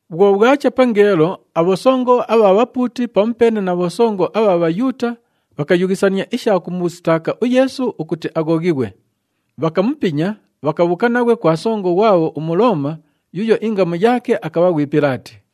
Bhwo bhwacha pangeelo, abhosongo abha bhapuuti pamupeene na bhosongo abha Bhayuuta bhakayughisania isha kumusitaaka uYeesu ukuti aghoghighwe. Bhakamupinya, bhakabhuuka naghwe kwa songo ghwabho uMulooma yuuyo ingamu yaake akabha ghwi Pilaati.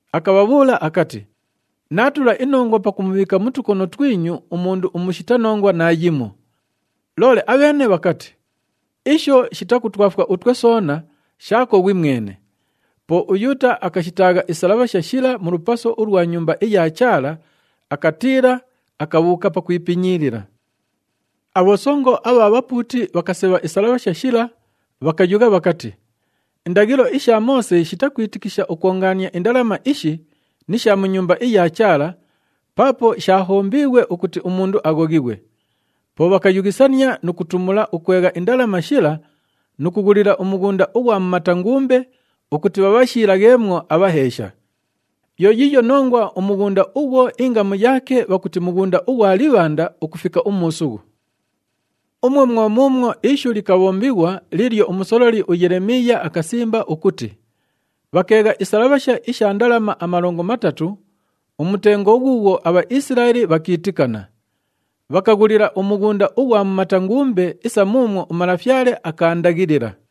Akabhabhuula akati, “Naatula inongwa pakumubhiika mu tukono twinyu umundu umushita nongwa naayimo.” Loole abheene bhakati, “Isho shitakutwafwa utwe soona, shaako ghwimwene.” Po uYuuta akashitaagha isalabhasha shila mu lupaso ulwa Nyumba iya Chaala, akatiila, akabhuuka pakwipinyiilila. Abhosongo abha bhapuuti bhakasebha isalabhasha shila, bhakayugha bhakati, “Indaghilo isha Moose shitakwitikisha ukwongaania indalama ishi ni sha mu Nyumba iya Chaala paapo shaahombiighwe ukuti umundu aghoghighwe.” Po bhakayughisania nu kutumula ukwegha indalama shila nu kughulila umughunda ughwa mumata ngumbe ukuti bhaabhashiilagheemwo abhaheesha. Yo yiiyo nongwa umughunda ughwo ingamu yaake bhakuti Mughunda ughwa Libhanda ukufika umuusughu. Umwo mwo muumwo ishu likabhombighwa liilyo umusololi uYelemiiya akasimba ukuti, “Bhakeegha isalabhasha isha ndalama amalongo matatu, umutengo ghuughwo aBhaisilaeli bhakiitikana. Bhakaghulila umughunda ughwa mumata ngumbe isa muumwo uMalafyale akaandaghilila.”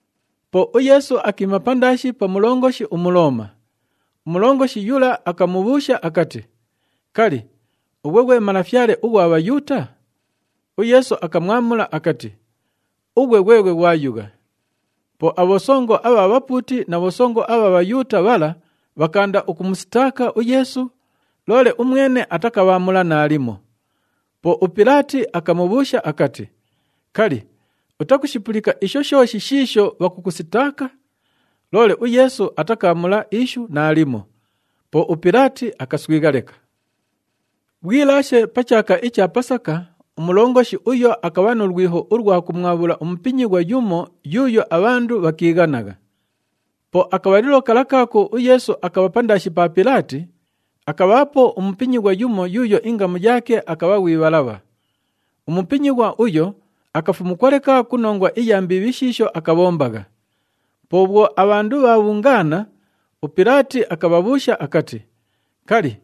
Po uYeesu akiima pandaashi pa mulongoshi uMulooma. Umulongoshi yula akamubhuusha akati, “Kali, ughwe ghwe Malafyale ughwa Bhayuuta?” UYeesu akamwamula akati, “Ughwe ghweghwe ghwayugha.” Po abhosongo abha bhapuuti na bhosongo abha Bhayuuta bhala bhakaanda ukumusitaaka uYeesu, loole umwene atakabhaamula naalimo. Po uPilaati akamubhuusha akati, “Kali, utakushipulika isho shooshi shiisho bhakukusitaaka?” Loole uYeesu atakaamula ishu naalimo. Po uPilaati akaswigha leka. Bhwilaashe pa chaaka icha Pasaka, umulongoshi uyo akabha nu lwiho ulwa kumwabhula umupinyighwa yumo yuuyo abhandu bhakiighanagha. Po akabhalilo kala kaako uYeesu akabha pandaashi pa Pilaati, akabhaapo umupinyighwa yumo yuuyo ingamu yaake akabha ghwi Bhalabha. Umupinyighwa uyo akafumukwa leka ku nongwa iya mbiibhi shiisho akabhombagha. Po bhwo abhandu bhaabhungaana, uPilaati akabhabhuusha akati, “Kali,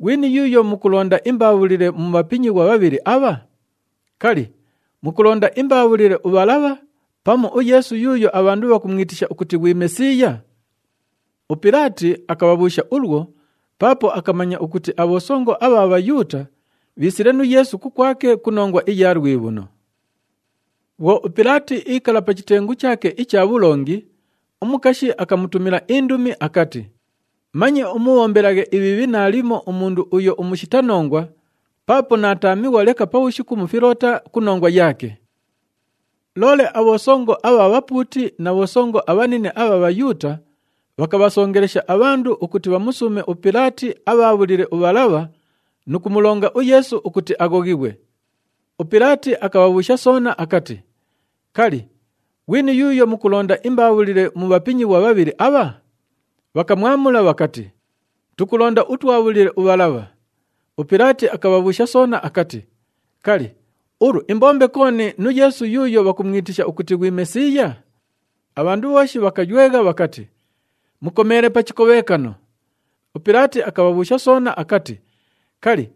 ghwini yuuyo mukulonda imbaabhulile mu bhapinyighwa bhabhili abha? Kali, mukulonda imbaabhulile uBhalabha pamu uYeesu yuuyo abhandu bhakumwitisha ukuti ghwi Mesiiya?” UPilaati akabhabhuusha ulwo paapo akamanya ukuti abhosongo abha Bhayuuta bhiisile nu Yeesu kukwake ku nongwa iya lwibhuno. Bhwo uPilaati iikala pa chitengu chaake icha bhulongi, umukashi akamutumila indumi akati, “Manye umubhombelaghe ibhiibhi naalimo umundu uyo umushita nongwa, paapo naataamighwa leka pabhushiku mu filoota ku nongwa yaake.” Loole abhosongo abha bhapuuti na bhosongo abhanine abha Bhayuuta bhakabhasongelesha abhandu ukuti bhamusuume uPilaati abhaabhulile uBhalabha nu kumulonga uYeesu ukuti aghoghighwe. UPilaati akabhabhuusha soona akati, “Kali, ghwini yuuyo mukulonda imbaabhulile mu bhapinyighwa bhabhili abha?” Bhakamwamula bhakati, “Tukulonda utwabhulile uBhalabha.” UPilaati akabhabhuusha soona akati, “Kali, ulu imbombe kooni nu Yeesu yuuyo bhakumwitisha ukuti ghwi Mesiiya?” Abhandu bhooshi bhakaywegha bhakati, “Mukomeele pa chikobhekano!” UPilaati akabhabhuusha soona akati, “Kali,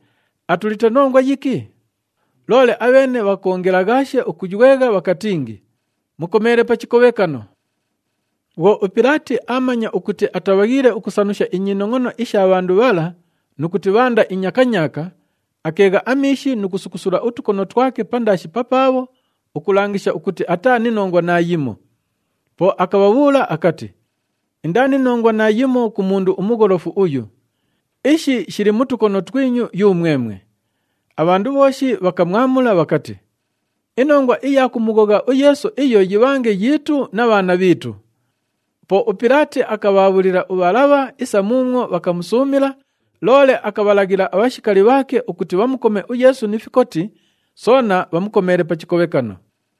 atulite nongwa yiki?” Loole abheene bhakoongelaghaashe ukuywegha bhakatingi, “Mukomeele pa chikobhekano!” Bhwo uPilaati aamanya ukuti atabhaghiile ukusanusha inyinongʼono isha bhandu bhala nu kuti bhaanda inyakanyaaka, akeegha amiishi nu kusukusula utukono twake pandaashi papaabho ukulangisha ukuti ataa ni nongwa naayimo. Po akabhabhuula akati, “Indaa ni nongwa naayimo ku mundu umugholofu uyu. Ishi shili mu tukono twinyu yumwemwe!” Abhandu bhooshi bhakamwamula bhakati, “Inongwa iya kumughogha uYeesu iyo yibhange yiitu na bhaana bhiitu!” Po uPilaati akabhaabhulila uBhalabha isa muumwo bhakamusuumila, loole akabhalaghila abhashikali bhaake ukuti bhamukome uYeesu ni fikoti, soona bhamukomeele pa chikobhekano.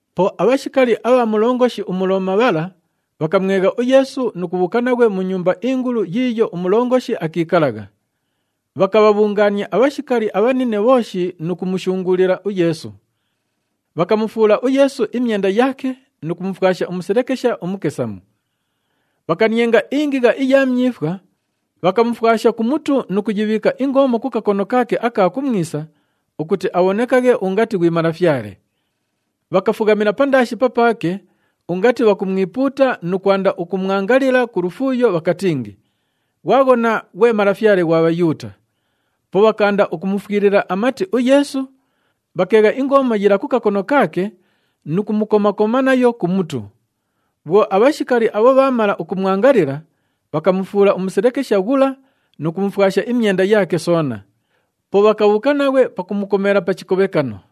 Po abhashikali abha mulongoshi uMulooma bhala, bhakamwegha uYeesu nu kubhuuka naghwe mu nyumba ingulu yiiyo umulongoshi akiikalagha. Bhakabhabhungaania abhashikali abhanine bhooshi nu kumushunguulila uYeesu. Bhakamufuula uYeesu imyenda yaake nu kumufwasha umuselekesha umukesamu. Bhakanienga ingigha iya myifwa, bhakamufwasha ku mutu nu kuyibhiika ingoomo ku kakono kaake aka kumwisa ukuti abhonekaghe ungati ghwi malafyale. Bhakafughamila pandaashi papaake ungati bhakumwipuuta nu kwanda ukumwangalila ku lufuuyo bhakatingi, “Ghwaghona, ghwe Malafyale ghwa Bhayuuta!” Po bhakaanda ukumufwilila amati uYeesu, bhakeegha ingoomo yila ku kakono kaake nu kumukoma-koma nayo ku mutu. Bhwo abhashikali abho bhaamala ukumwangalila, bhakamufuula umuselekesha ghula nu kumufwasha imyenda yaake soona. Po bhakabhuuka naghwe pakumukomeela pa chikobhekano.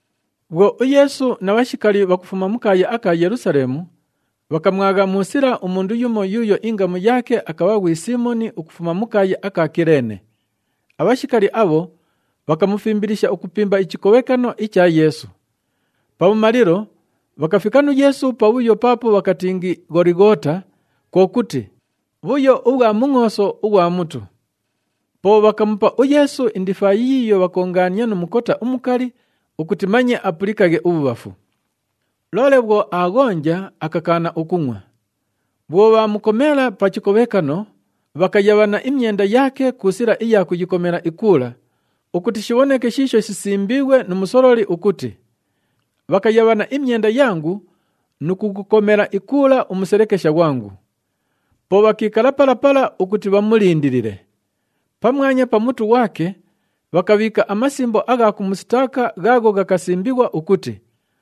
Bhwo uYeesu na bhashikali bhakufuma mu kaaya aka Yelusaleemu, bhakamwagha mu sila umundu yumo yuuyo ingamu yaake akabha ghwi Siimoni ukufuma mu kaaya aka Kileene. Abhashikali abho bhakamufimbilisha ukupimba ichikobhekano icha Yeesu. Pabhumalilo, bhakafika nu Yeesu pabhuyo paapo bhakatingi Gholighoota, kwo kuti, “Bhuyo ubhwa Mungʼooso ughwa Mutu.” Po bhakamupa uYeesu indifaayi yiiyo bhakoongaania nu mukota umukali ukuti manye apulikaghe ubhubhafu. Loole bhwo aaghonja, akakaana ukungʼwa. Bhwo bhaamukomeela pa chikobhekano, bhakayabhana imyenda yaake ku sila iya kuyikomela ikuula, [ukuti shibhoneke shiisho shisimbiighwe nu musololi ukuti, “Bhakayabhana imyenda yangu, nu kughukomela ikuula umuselekesha ghwangu.”] Po bhakiikala pala pala ukuti bhamulindilile. Pamwanya pa mutu ghwake, bhakabhiika amasimbo agha kumusitaaka ghaagho ghakasimbighwa ukuti,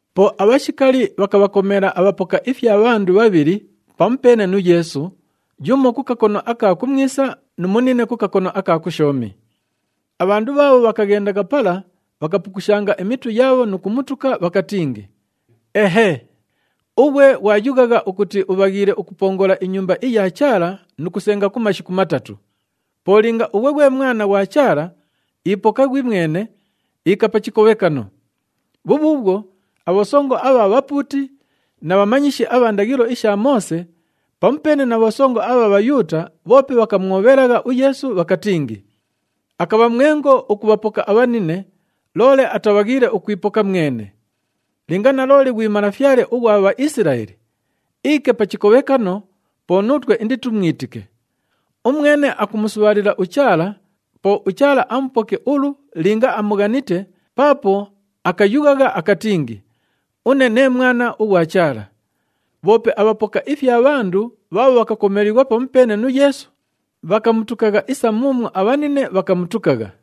Po abhashikali bhakabhakomeela abhapoka ifya bhandu bhabhili pamupeene nu Yeesu, yumo ku kakono aka kumwisa nu munine ku kakono aka kushoomi. Abhandu bhaabho bhakaghendagha pala, bhakapukushanga imitu yaabho nu kumutuka, bhakatingi, “Ehee! Ughwe ghwayughagha ukuti ubhaghiile ukupongola iNyumba iya Chaala nu kusenga ku mashiku matatu, po linga ghwe Mwana ghwa Chaala, ipoka ghwimwene, iika pa chikobhekano!” Bhubhuubhwo, abhosongo abha bhapuuti na bhamanyishi abha ndaghilo isha Moose pamupeene na bhosongo abha Bhayuuta bhoope bhakamwobhelagha uYeesu bhakatingi, “Akabha mwengo ukubhapoka abhanine, loole atabhaghiile ukwipoka mwene! Linga nalooli ghwi Malafyale ughwa Bhaisilaeli, iike pa chikobhekano, po nuutwe inditumwitike. Umwene akumusubhaalila uChaala, po uChaala amupoke ulu linga amughanite paapo akayughagha akatingi, ‘Une nee Mwana ughwa Chaala.’” Bhoope abhapoka ifya bhandu bhaabho bhakakomeelighwa pamupeene nu Yeesu, bhakamutukagha isa muumwo abhanine bhakamutukagha.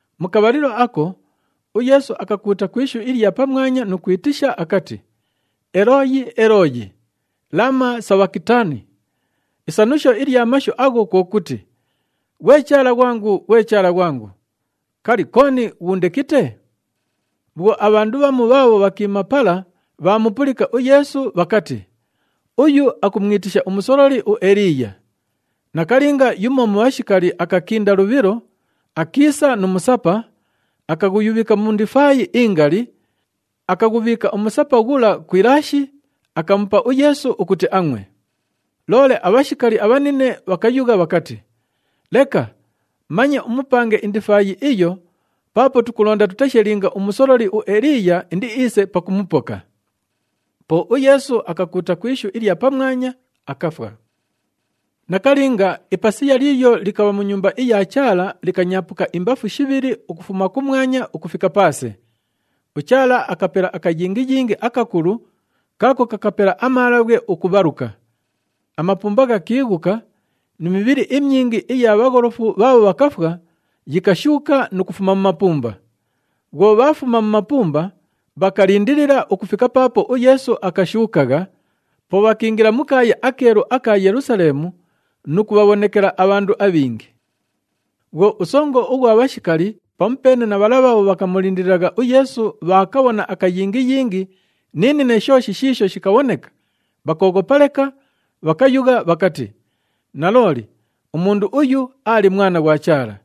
Mu kabhalilo ako, uYeesu akakuuta ku ishu ilya pamwanya nu kwitisha akati, “Elooyi! Elooyi! Lama sabhakitani?” Isanusho ilya mashu agho kwo kuti, “Ghwe Chaala ghwangu! Ghwe Chaala ghwangu! Kali, kooni ghuundekite?” Bhwo abhandu bhamu bhaabho bhakiima pala bhaamupulika uYeesu, bhakati, “Uyu akumwitisha umusololi uEliiya.” Nakalinga, yumo mu bhashikali akakinda lubhilo, akiisa nu musapa, akaghuyubhika mu ndifaayi ingali, akaghubhiika umusapa ghula ku ilaashi, akamupa uYeesu ukuti angʼwe. Loole abhashikali abhanine bhakayugha bhakati, “Leka, manye umupange indifaayi iyo paapo tukulonda tuteshe linga umusololi uEliiya indiiise pakumupoka!” Po uYeesu akakuuta ku ishu ilya pamwanya, akafwa. Nakalinga, ipasiya liilyo likabha mu Nyumba iya Chaala likanyaapuka imbafu shibhili ukufuma kumwanya ukufika paase. UChaala akapela akayingiyingi akakulu kaako kakapela amaalabhwe ukubhaluka. Amapumba ghakiighuka ni mibhili imyingi iya bhagholofu bhaabho bhakafwa yikashuuka nu kufuma mu mapumba. Bhwo bhaafuma mu mapumba, bhakalindilila ukufika paapo uYeesu akashuukagha, po bhakiingila mu kaaya akeelu aka Yelusaleemu nu kubhabhonekela abhandu abhingi. Bhwo usongo ughwa bhashikali pamupeene na bhala bhaabho bhakamulindililagha uYeesu bhaakabhona akayingiyingi ni nine shooshi shiisho shikabhoneka, bhakooghopa leka, bhakayugha bhakati, “Nalooli, umundu uyu aali Mwana ghwa Chaala!”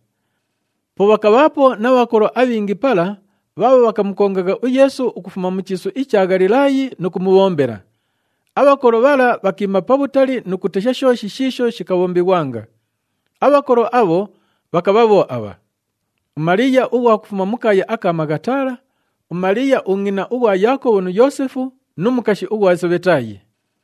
Po bhakabhaapo na bhakolo abhingi pala bhaabho bhakamukongagha uYeesu ukufuma mu chiisu icha Ghalilaayi nu kumubhombela. Abhakolo bhala bhakiima pabhutali nu kutesha shooshi shiisho shikabhombighwanga. Abhakolo abho bhakabha bho abha: uMaliiya ughwa kufuma mu kaaya aka Maghatala, uMaliiya ungʼina ughwa Yaakobhu nu Yoosefu, nu mukashi ughwa Sebhetaayi.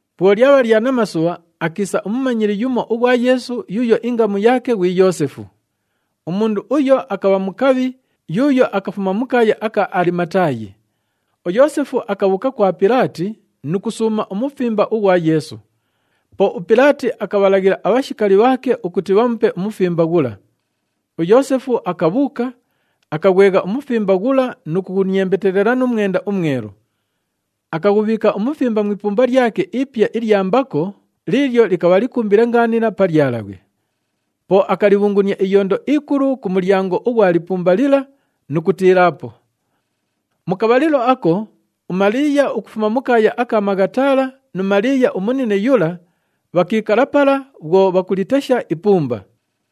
Bhwo lyabha lya namasubha, akiisa umumanyili yumo ughwa Yeesu yuuyo ingamu yaake ghwi Yoosefu. Umundu uyo akabha mukabhi yuuyo akafuma mu kaaya aka Alimataayi. UYoosefu akabhuuka kwa Pilaati nu kusuuma umufimba ughwa Yeesu. Po uPilaati akabhalaghila abhashikali bhaake ukuti bhamupe umufimba ghula. UYoosefu akabhuuka, akaghwegha umufimba ghula nu kughuniembetelela nu mwenda umwelu. Akaghubhiika umufimba mu ipumba lyake ipya ilya mbako liilyo likabha likumbile ngaanila pa lyalabhwe. Po akalibhungunia iyondo ikulu ku mulyango ughwa lipumba lila nu kutiilaapo. Mu kabhalilo ako, uMaliiya ukufuma mu kaaya aka Maghatala nu Maliiya umunine yula, bhakiikala pala bhwo bhakulitesha ipumba.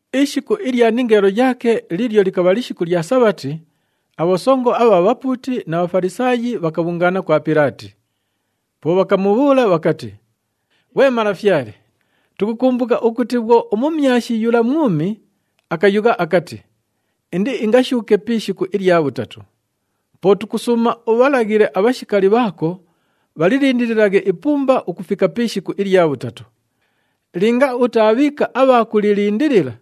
Ishiku ilya ningeelo yaake liilyo likabha lishiku lya Sabhati, abhosongo abha bhapuuti na Bhafalisaayi bhakabhungaana kwa Pilaati. Po bhakamubhuula bhakati, “Ghwe malafyale, tukukumbuka ukuti bhwo umumyashi yula mwumi, akayugha akati, ‘Indiingashuuke pi ishiku ilya bhutatu.’ Po tukusuuma ubhalaghile abhashikali bhaako bhalilindililaghe ipumba ukufika pi ishiku ilya bhutatu. Linga utaabhiika abha kulilindilila,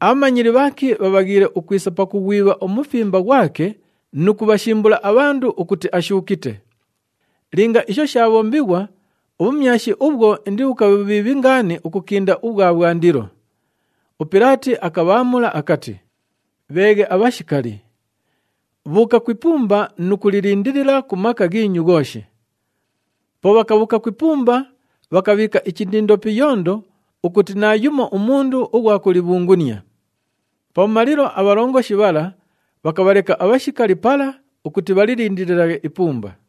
abhamanyili bhaake bhabhaghiile ukwisa pakughwibha umufimba ghwake nu kubhashimbula abhandu ukuti ashuukite. Linga isho shaabhombighwa, ubhumyashi ubhwo indibhukabhe bhubhiibhi ngaani ukukinda ubhwa bhwandilo.” UPilaati akabhaamula akati, “Bheeghe abhashikali. Bhuuka ku ipumba nu kulilindilila ku maka ghiinyu ghooshi.” Po bhakabhuuka ku ipumba, bhakabhiika ichindindo pi iyondo ukuti naayumo umundu ughwa kulibhungunia. Pabhumalilo, abhalongoshi bhala bhakabhaleka abhashikali pala ukuti bhalilindililaghe ipumba.